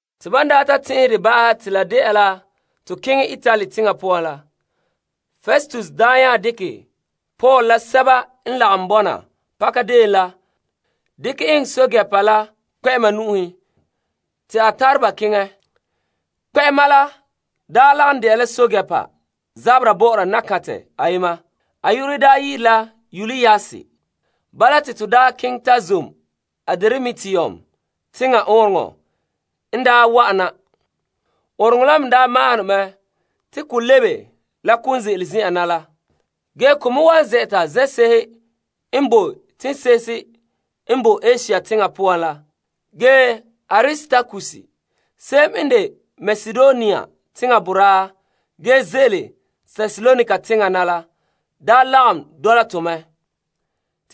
Te ban daa ta tɛn'ɛhɛ dɛ ba'ahɛ te la de'a la to keŋɛ Itali teŋa poan la, Festus daa nya dekɛ Paul la sɛba n lagom bɔna pakadeen la dekɛ eŋɛ pɛɛntɛɛnreba kpɛ'ɛma nu'uhen te a tare ba keŋɛ. Kpɛ'ɛma la daa lagom de'a la pɛɛntɛɛnreba zabera bɔ'ɔra nakantɛ ayema te a yu'urɛ dela la Yulius. Bala te to keŋɛ ta zom Adramitium teŋa ɔɔnrɔŋɔ kantɛ n daa wa'an na. Ɔɔnrɔŋɔ kantɛ la me maahom ne mɛ te ko lebe la kon ze'ele zen'an na la. Ge ko me wan zɛ'ɛta zen'se'ehe n bo teŋse'ehe n bo Asia teŋa poan la. Ge Aristarkus se'em n de Makedonia teŋa boraa ge ze'ele Tesalonika teŋa na la lagom dɔla tɔ mɛ.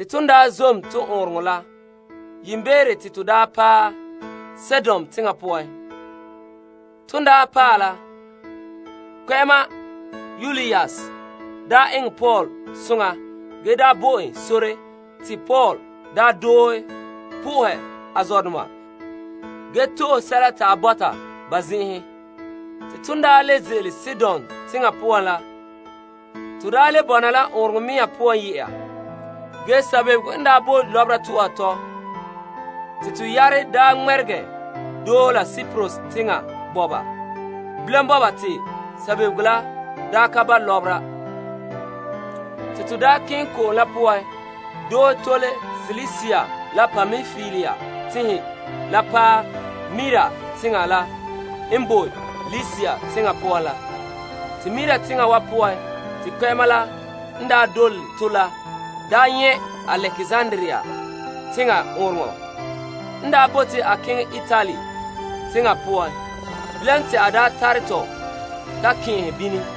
Ton daa zom to ɔɔnrɔŋɔ kantɛ la, yiimbeere te to paɛ Sidon teŋa poan te kpɛ'ɛma Yulius eŋɛ Paul soŋa ge bo en sore te a daa doohe po'ohɛ a zɔdoma ge to'ohe sɛla te a bɔta ba zen'enhen. Ton daa le ze'ele Sidon teŋa poan la, to le bɔna la ɔɔnrɔŋɔ kantɛ mea poan ye'a ge sabebego n bo lɔbera tu'uha tɔ zo'e zo'e te to yare ŋmɛregɛ doohe la Kiprus teŋa bɔba. Bilam bɔba te sabebego la ka ba' lɔbera. Te to keŋɛ ko'om la poan doohe tole Silisia la Pampilia tenhen la paɛ Mira teŋa la n bo Likia teŋa poan la te kpɛ'ɛma la nyɛ' Alekzandria teŋa ɔɔnrɔŋɔ kantɛ n bote a keŋɛ Itali teŋa poan. Bilam te a tare tɔ ta kɛn'ɛhɛ bini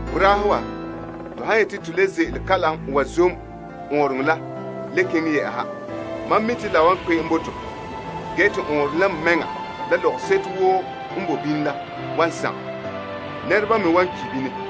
Boraahe wa, to han yete to le ze'ele kalam wa zom ɔɔnrɔŋɔ kantɛ la le keŋɛ yɛ'ɛha, mam mi' te la wan kpe'em zo'e zo'e bo to. Ge te ɔɔnrɔŋɔ kantɛ mɛŋa la la lɔgɔseto woo n bo bini la wa sagom zo'e zo'e. Nɛreba me wa ki' bini.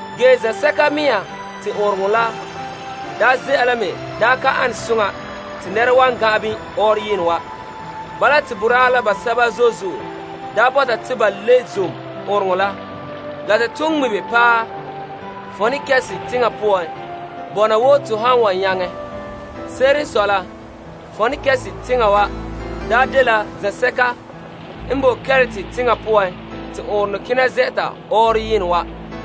Zen'sɛka mea te to ɔɔnrɔŋɔ kantɛ la ze'a la me ka ane soŋa te nɛra wan gan'an bini ɔɔrɔyenɛ wa. Bala te basɛba zo'e zo'e bɔta te to le zom ɔɔnrɔŋɔ kantɛ la to kɔ'ɔn ŋmibe paɛ Poeniks teŋa poan bɔna wo to han wan nyaŋɛ. Se'ere n sɔe la Poeniks teŋa dela zensɛka n boe Krete teŋa bɔna zuɔ la gɔbega nu'uhe bɔba te ɔɔnrɔŋɔ kantɛ kena zɛ'ɛta ɔɔrɔyenɛ wa.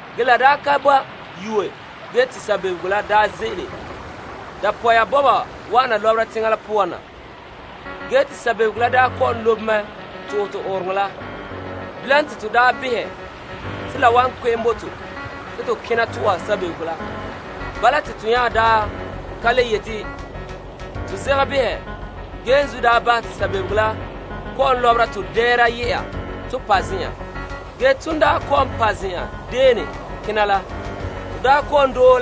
Ge la ka ba yue ge te sabebego ze'ele dapɔya bɔba wana lɔbera teŋa la poan na. Sabebego la n kɔ'ɔn lobe mɛ to'ohɛ tɔ ɔɔnrɔŋɔ kantɛ la. Bilam te to behɛ te la wan kpe'em bo to te to kena tu'uha sabebego la. Bala te to nya ka le yete to zegɛ behɛ ge yiinzuo bahɛ te sabebego la kɔ'ɔn lɔbera tɔ dɛɛra ye'a ton pa' zen'an. Ton pa' zen'an dene kena la, te to kɔ'ɔn doohe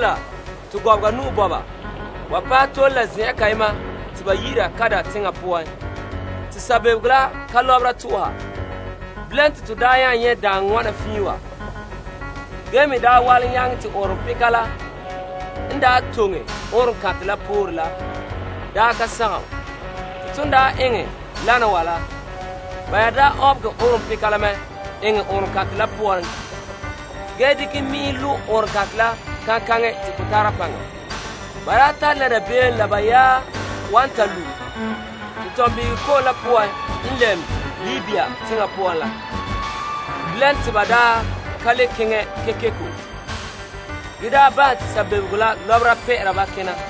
to gɔbega nu'o bɔba wa paɛ tole la zen'an kayema te ba yi'ira Kauda teŋa poan te sabebego la ka lɔbera tu'uha. Bilam te to nyɛ' daaŋɔ wana fiin wa ge me walom nyaŋɛ te ɔɔnrɔŋpeka la n toŋe ɔɔnrɔŋkantɛ la pore la ka sagom. Te ba nya ɔnbegɛ ɔɔnrɔŋpeka la mɛ eŋɛ ɔɔnrɔŋɔ kantɛ la poan ge dekɛ mi'inhe lo' ɔɔnrɔŋkantɛ la kaŋkaŋɛ te ko tara paŋa. Ba tare la dabeem la ba yaɛ wan ta lu' tentɔnbin'ihegɔ ko'om la poan Sirtis teŋa poan la. Bilam te ba ka le keŋɛ kekeko ge nya bahɛ te sabebego la lɔbera pɛ'ɛra ba kena.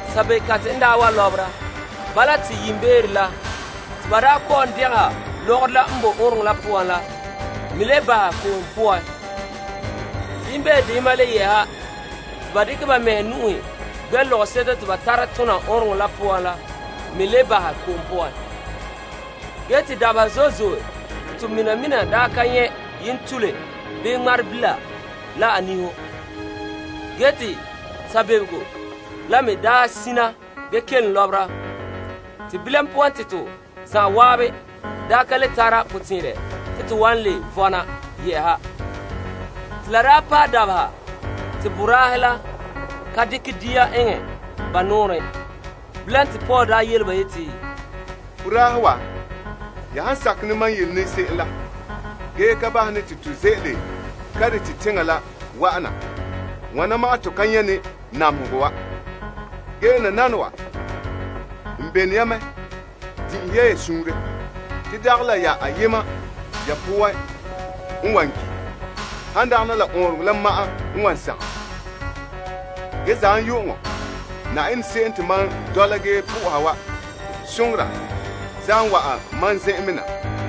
Sabebekantɛ n wa lɔbera zo'e zo'e la zuo, te yiimbeere la ba kɔ'ɔn degeha lɔgɔrɔ la n boe ɔɔnrɔŋɔ kantɛ la poan la me le bahɛ ko'om poan. Te yiimbeere deyema la yɛ'ɛha te ba dekɛ ba mɛhe nu'uhe gbɛ' lɔgɔseto te ba tare tona ɔɔnrɔŋɔ kantɛ la poan la mɛ bahɛ ko'om poan. Dabeha zo'e zo'e n tole te to mina mina ka nyɛ' yentule bii ŋmarebila la a niho. Te sabebego la me sina ge kelom lɔbera zo'e zo'e. Bilam poan te to zan'an ka le tare potɛn'ɛrɛ te to wan le vɔna yɛ'ɛha. Te la paɛ dabeha te boraahe la ka dekɛ dia eŋɛ ba nɔɔrɛn. Bilam te Paul yele ba yeti, Boraahe wa, ya han sakɛ ne mam yele ne se'em la ge ka bahɛ ne te to ze'ele Krete teŋa la wa'an na, wana ma'an to ka nyɛ' ne namehegɔ wa'ana wa zo'e zo'e. Ge nananawa n bene ya mɛ, din'inhe ya suunre. Te dagɛ la ya ayema ya poan n wan ki'. Han dagana la ɔɔnrɔŋɔ kantɛ la ma'an n wan sagom. Zam la yu'uŋɔ Yenɛ se'em te mam dɔla ge na'aha wa soŋora ayema wa'an mam zen'an mɛ na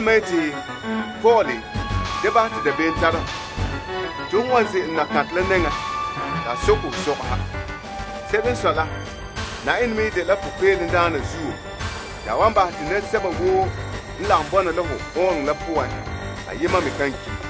yeti, Paul, da bahɛ te dabeem tare hɔ. Te hon wan ze'ele Kaesar la nɛŋa. Se'ere n sɔe la Yenɛ zo'ohogɔ zuo te a wan bahɛ te nɛresɛba woo n lagom bɔna la hɔ ɔɔnrɔŋɔ kantɛ la poan ayema me kan ki'.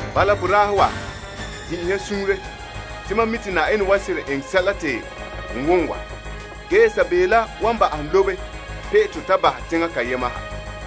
Bala, boraahe wa, din'inhe ya suunre. Te mam mi' te Yenɛ wan seren eŋɛ sɛla te n wom wa. Ge yia, sabebego la wan ba'ahɛ lobe pe'e to ta bahɛ teŋa kayema ha.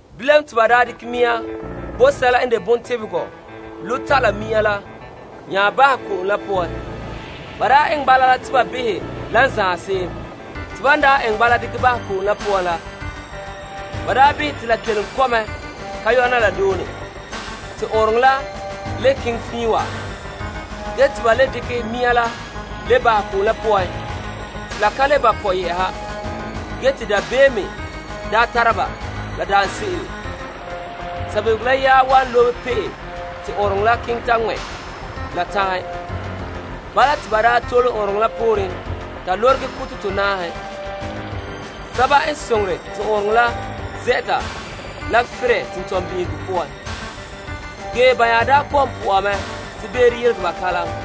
Bilam te ba dekɛ mi'an bɔ sɛla n de bontebegegɔ lu' ta' la mi'an la nya bahɛ ko'om la poan. Ba eŋɛ bala la te ba behɛ la lan zaen se'em. Te ban daa eŋɛ bala dekɛ bahɛ ko'om la poan la, ba behɛ te la kelom kɔ' mɛ zo'e zo'e ka yona la done. Te ɔɔnrɔŋɔ kantɛ la le keŋɛ fiin wa ge te ba le dekɛ mi'an la le bahɛ ko'om la poan te la ka le ba' kɔ' yɛ'ɛha. Dabeem n me tare ba la daanse'ere sabebego la yaɛ wan lobe pe'e te ɔɔnrɔŋɔ kantɛ la keŋɛ ta ŋmɛ' la tanhen. Bala te ba tole ɔɔnrɔŋɔ kantɛ la pooren ta lorege kuto tonaahe, sɛba n suunre te ɔɔnrɔŋɔ kantɛ la zɛ'ɛta la ferɛ tentɔnbin'ihegɔ poan. Ge ba nya kɔ'ɔn bɔta te beere yelegɛ ba kalam.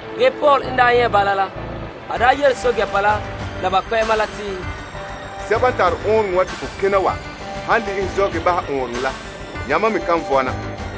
Paul n nyɛ' bala la, a yele kpɛ'ɛma la a pɛɛntɛɛnreba la yeti, Sɛba n tare ɔɔnrɔŋɔ kantɛ wa te ko kena wa han le'ehɛ zɔ' ge bahɛ ɔɔnrɔŋɔ kantɛ la, yamam me kan vɔna.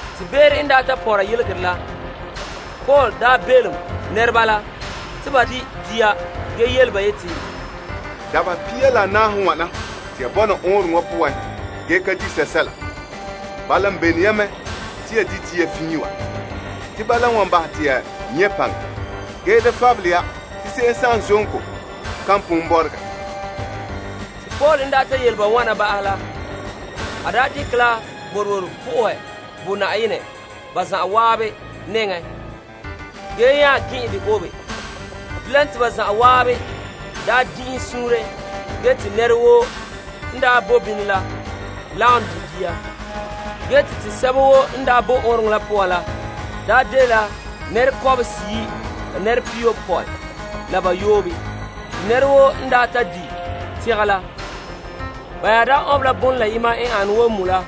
Te beere n ta pɔnra yelegerɛ la, Paul belom nɛreba la te ba di' dia ge yele ba yeti, Dabeha pia la anaahe n wane te ya bɔna ɔɔnrɔŋɔ kantɛ wa poan ge ka di' sɛsɛla. Bala n bene ya mɛ te ya di' dia fiin wa te bala n wan bahɛ te ya nyɛ' paŋa. Ge da fabele ya te se'em zonto pon kan bɔregɛ. En ta yele ba wana ba'ahɛ la, a dekɛ la boroboro po'ohɛ bo Yenɛ ba zan'an nɛŋa ge nya gɛn'ɛn dɛ obe. Bilam te ba zan'an din'inhe suunre ge te nɛra woo n bo bini la lagom di' dia. Te to sɛba woo n bo ɔɔnrɔŋɔ kantɛ la poan la daa dela nɛra kɔbehe seyi' la nɛra pihiyopɔe la bayoobe. Ban ta di' tegɛ la, ba nya ɔnbɛ la bon la yema n ane wo moe la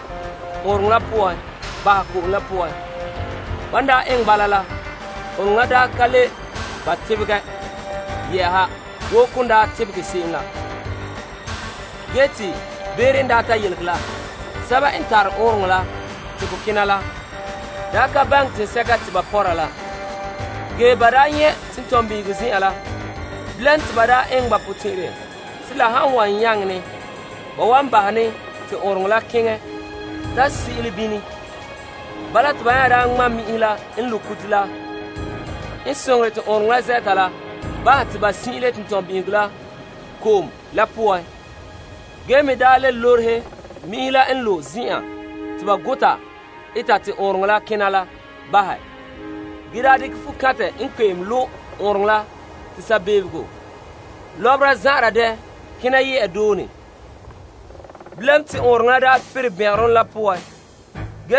ɔɔnrɔŋɔ kantɛ la poan bahɛ ko'om la poan. Ban eŋɛ bala la, ɔɔnrɔŋɔ kantɛ la ka le ba' tebegɛ yɛ'ɛha wo kon daa tebegɛ se'em la. Ge te beere n yelegɛ la, sɛba n tare ɔɔnrɔŋɔ kantɛ la te ko kena la ka baŋɛ teŋsɛka te ba pɔnra la ge ba nyɛ' la tentɔnbin'ihegɔ zen'an la. Bilam te ba eŋɛ ba potɛn'ɛrɛ te la han wan nyaŋɛ ne, ba wan bahɛ ne te ɔɔnrɔŋɔ kantɛ la keŋɛ ta sin'inle bini. Bala te ba nya ŋma' mi'inhe la n lo' kuto la n soŋore te ɔɔnrɔŋɔ kantɛ la zɛ'ɛta la bahɛ te ba sin'inle tentɔnbin'ihegɔ ko'om la poan ge me le lorehe mi'inhe la n lo' zen'an te ba gota eta te ɔɔnrɔŋɔ kantɛ la kena la bahɛ, ge dekɛ fukantɛ n kpe'em lo' ɔɔnrɔŋɔ kantɛ la te sabego lɔbera zan'anra dɛ kena ye'a doone. Bilam te ɔɔnrɔŋɔ kantɛ la ferɛ bɛngɛrɔ la poan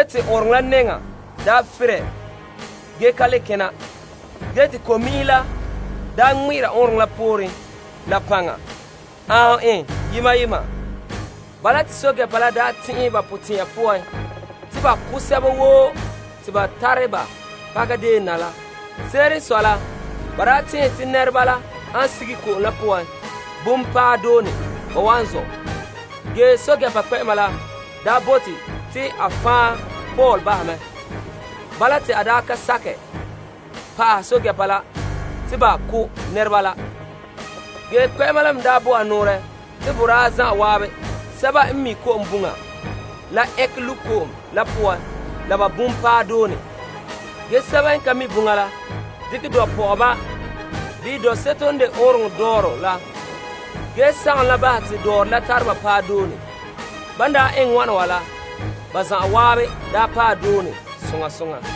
te nɛŋa daa ferɛ ge ka le kena, ge te ko'mi'inhe la ŋmɛ'ɛra ɔɔnrɔŋɔ kantɛ la pooren la paŋa aanhom yema yema. Pɛɛntɛɛnreba la tɛn'ɛha ba potɛn'ya poan te ba wan ko' sɛba woo te ba daa tare ba pakadeen na la. Se'ere n sɔe la ba daa tɛn'ɛhe te nɛreba la han sige ko'om la poan bum paɛ doone, ba wan zɔ'. Ge pɛɛntɛɛnreba kpɛ'ɛma bote te a fan' Paul bahɛ mɛ te a ka sakɛ bahɛ pɛɛntɛɛnreba la te ba ko' nɛreba la. Kpɛ'ɛma me bo nɔɔrɛ te ba zan'an sɛba n mi' ko'om buŋa la, ɛnkɛ lu' ko'om la poan la ba bum paɛ doone. Ge basɛba me n ka mi' buŋa la, dekɛ dɔɔrɔ pɔ'ɔba bii dɔɔseto n de ɔɔnrɔŋɔ kantɛ dɔɔrɔ la ge sagom bahɛ te dɔɔrɔ la tare ba paɛ doone. Ba zan'an eŋɛ wana wa la, te ba zan'an paɛ doone soŋa soŋa.